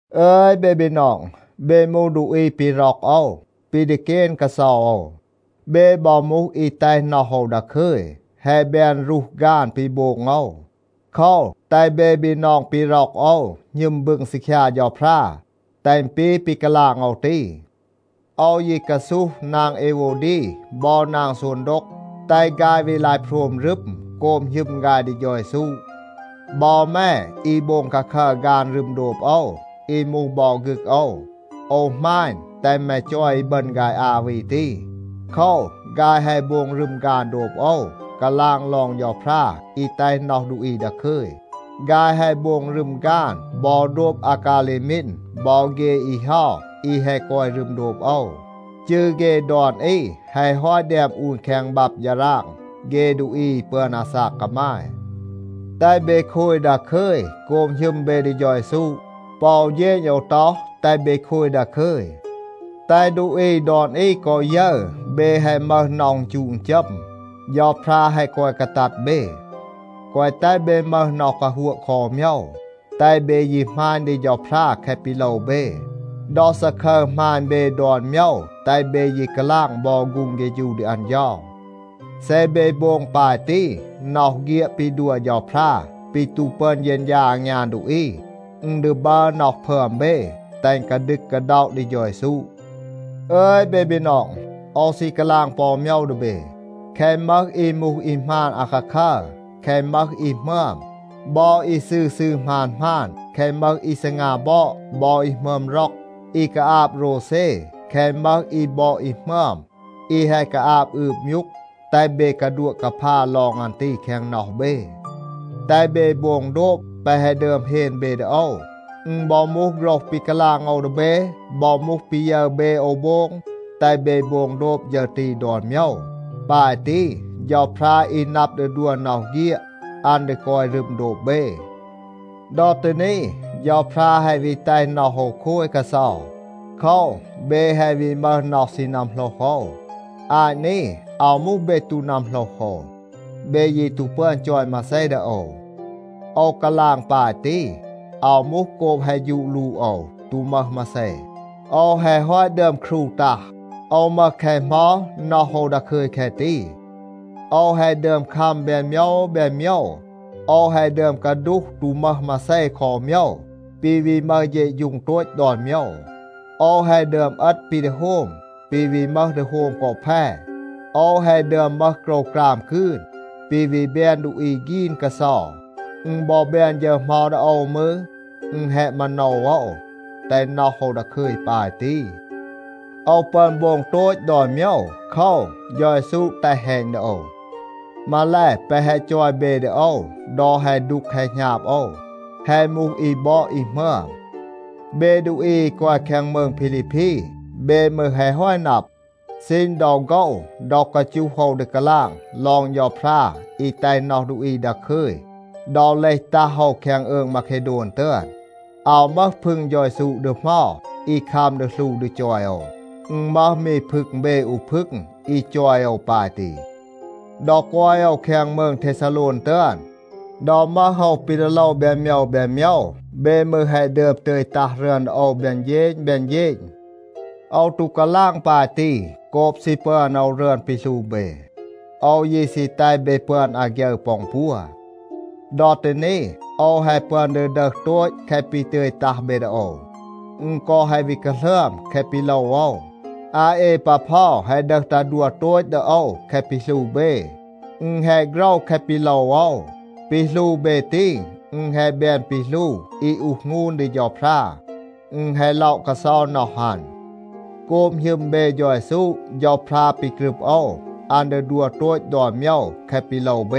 อึย เบ บีนอง, เบ มูห ดูอี ปี ร็อก โอว, ปี ดีเกน กาเซา โอว. เบ บอ มูห อี แตห น็อห โอว ดาคึย, แฮะ แบน รูห ฆาน ปี โบง โอว. โคว, แตห เบ บีนอง ปี ร็อก โอว หณึม บึง ซีคยา เฌาพรา, แตห อึณ ปี ปี กาลาง โอว ตี. โอว ยี กาซูห นาง เอโววดี บอ นาง ซูนโดก, แตห ฆาย วี ลาย โพรม รึม โกบ หณึม ฆาย ดี เฌา เยซู. บอ แม อี โบง คาคัร ฆาน รึม โดบ โอว, อี มูห บอ ฆึก โอว, โอว หมาณ, แตห แม จอย อีบึณ ฆาย อา วี ตี. โคว, ฆาย แฮะ โบง รึม ฆาน โดบ โอว, กาลาง ลอง เฌาพรา อี แตห น็อห ดูอี ดาคึย. ฆาย แฮะ โบง รึม ฆาน บอ โดบ อากาเลมีน บอ เฆ อี เฮา อี แฮะ กอย รึม โดบ โอว. จืร เฆ ดอน อี แฮะ ฮอต แดม อูน แคง บับ ฌาราง เฆ ดูอี อี ปึอน อาซาก กามาย. แตห เบ โคย ดาคึย โกบ หณึม เบ ดี เฌา เยซู. ปอ อู เฌณ โอว ต็อห, แตห เบ โคย ดาคึย. แตห ดูอี ดอน อี กอ ยึร, เบ แฮะ มึห น็อห อึณจูะ อึณจัม. เฌาพรา แฮะ กอย กาตัด เบ. แกวะ แตห เบ มึห น็อห กาฮัวะ คอ อู โมยว. แตห เบ ยี หมาณ ดี เฌาพรา แคะ ปี โลว เบ. ดอ ซาคึร หมาณ เบ ดอน โมยว, แตห เบ ยี กาลาง บอ ฆูง เฆฌู ดี อัน เฌา. เซ เบ โบง ปาย ตี, น็อห เฆียด ปี ดัว เฌาพรา ปี ตู ปึอน เฌณฌา อางยาน ดูอี, อึณ ดี บัร น็อห พึอม เบ, แตห อึณ กาดึก กาด็อะ ดี เฌา เยซู. อึย เบ บีนอง, โอว ซี กาลาง ปอ อู โมยว ดี เบ. แคะ มึห อี มูห อี หมาน อาคาคัร, แคะ มึห อี หมึอม, บอ อี ซืร ซืร หมาน หมาน, แคะ มึห อี ซีงา บอด บอ อี หมึอม ร็อก, อี กาอาบ โรวเซ, แคะ มึห อี บอด อี หมึอม, อี แฮะ กาอาบ อืบ มยูก, แตห เบ กาดัวะ กาพา ลอง อัน ตี แคง น็อห เบ. แตห เบ โบง โดบ แปะ แฮะ ดึอม เฮน เบ ดี โอว. อึณ บอ มูห โฆรห ปี กาลาง โอว ดี เบ, บอ มูห ปี ยึร เบ โอว โบง, แตห เบ โบง โดบ ฌึร ตี ดอน โมยว. ปาย ตี, เฌาพรา อี นับ ดี ดัว น็อห เฆียด, อัน ดี กอย รึม โดบ เบ. ดอ ตี นี, เฌาพรา แฮะ วี แตห น็อห โอว โคย กาเซา. โคว, เบ แฮะ วี มึห น็อห ซี นัมโหลห โอว. อาต นี, อาว มูห เบ ตู นัมโหลห โอว, เบ ยี ตู ปึอน จอย มาเซ ดี โอว. โอว กาลาง ปาย ตี, อาว มูห โกบ แฮะ ฌูด ลูด โอว, ตู มึห มาเซ. โอว แฮะ ฮอต ดึอม ครู ตัห, โอว มึห แคะ เหมา, น็อห โอว ดาคึย แคะ ตี. โอว แฮะ ดึอม คัม แบน โมยว แบน โมยว. โอว แฮะ ดึอม กาดูห ตู มึห มาเซ คอ อู โมยว, ปี วี มึห เฌะฌูง โตต ดอน โมยว. โอว แฮะ ดึอม เอต ปี ดี โฮม, ปี วี มึห ดี โฮม กอ แพ. โอว แฮะ ดึอม มึห โกรวกราม กืน, ปี วี แบน ดูอี ฆีน กาเซา. อึณ บอ แบน ฌึร เหมา ดี โอว มืร, อึณ แฮะ มาโนว โอว, แตห น็อห โอว ดาคึย ปาย ตี. โอว ปึอน โบง โตต ดอน โมยว. โคว, เฌา เยซู แตห แฮณ ดี โอว. มาแล, แปะ แฮะ จอย เบ ดี โอว ดอ แฮะ ดูก แฮะ หณาบ โอว, แฮะ มูห อี บอด อี หมึอม. เบ ดูอี อี กอย แคง มืง พีลีพี, เบ มืร แฮะ ฮอต นับ, ซีณ ดอ โฆว ดอ กาจูห โอว ดี กาลาง ลอง เฌาพรา อี แตห น็อห ดูอี ดาคึย ดอ เลห ตัห โอว แคง อืง มาเคโดน ตึอน, อาว มึห พึง เฌา เยซู ดี เหมา อี คัม ดี หลู ดี จอย โอว, อึณ มึห มี พึง เบ อู พึง อี จอย โอว ปาย ตี. ดอ กอย โอว แคง มืง เทซาโลน ตึอน, ดอ มึห โอว ปี ดี โลว แบน โมยว แบน โมยว, เบ มืร แฮะ ดึอม ตึย ตัห รึอน ดี โอว แบน เฌณ แบน เฌณ. โอว ตู กาลาง ปาย ตี โกบ ซี ปึอน โอว รึอน ปี หลู เบ. โอว ยี ซี แตห เบ ปึอน อาฆยึร ปอ อึณ ปัว. ดอ ตี นี โอว แฮะ ปึอน ดี ดึห โตต แคะ ปี ตึย ตัห เบ ดี โอว. อึณ กอ แฮะ วี กาหลึอม แคะ ปี โลว โอว. อาเอปาพอ แฮะ ดึห ตัห ดัว โตต ดี โอว แคะ ปี หลู เบ. อึณ แฮะ โฆรว แคะ ปี โลว โอว. ปี หลู เบ ตี, อึณ แฮะ แบน ปี หลู อี อูห หงูน ดี เฌาพรา. อึณ แฮะ ล็อะ กาเซา น็อห อัน. โกบ หณึม เบ เฌา เยซู, เฌาพรา ปี กรึบ โอว, อัน ดี ดัว โตต ดอน โมยว แคะ ปี โลว เบ.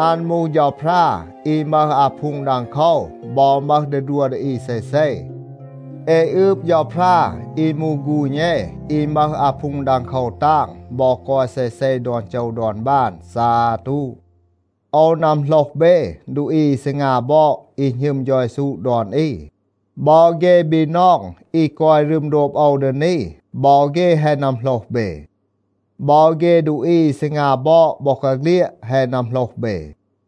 อัน มูห เฌาพรา อี มึห อาพูง ดังโคว บอ มึห ดี ดัว ดี อี เซเซ. เอ อืบ เฌาพรา อี มูห ฆูณ เอ, อี มึห อาพูง ดังโคว ตาง บอ กอย เซเซ ดอน โจว ดอน บาน. ซาตู. โอว นัมโหลห เบ ดูอี อี ซีงา บอด อี หณึม เฌา เยซู ดอน อี. บอ เฆ บีนอง อี กอย รึม โดบ โอว ดี นี, บอ เฆ แฮะ นัมโหลห เบ. บอ เฆ ดูอี อี ซีงา บอด บอกาเฆลียด แฮะ นัมโหลห เบ.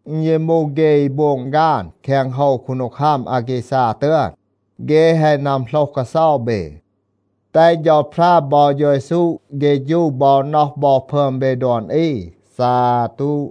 อึณ ยี มูห เฆ อี โบง ฆาน แคง โฮว คูนดีคัม อาแกซา ตึอน, เฆ แฮะ นัมโหลห กาเซา เบ. แตห เฌาพรา บอ เฌา เยซู เฆฌู บอ น็อห บอ พึอม เบ ดอน อี. ซาตู.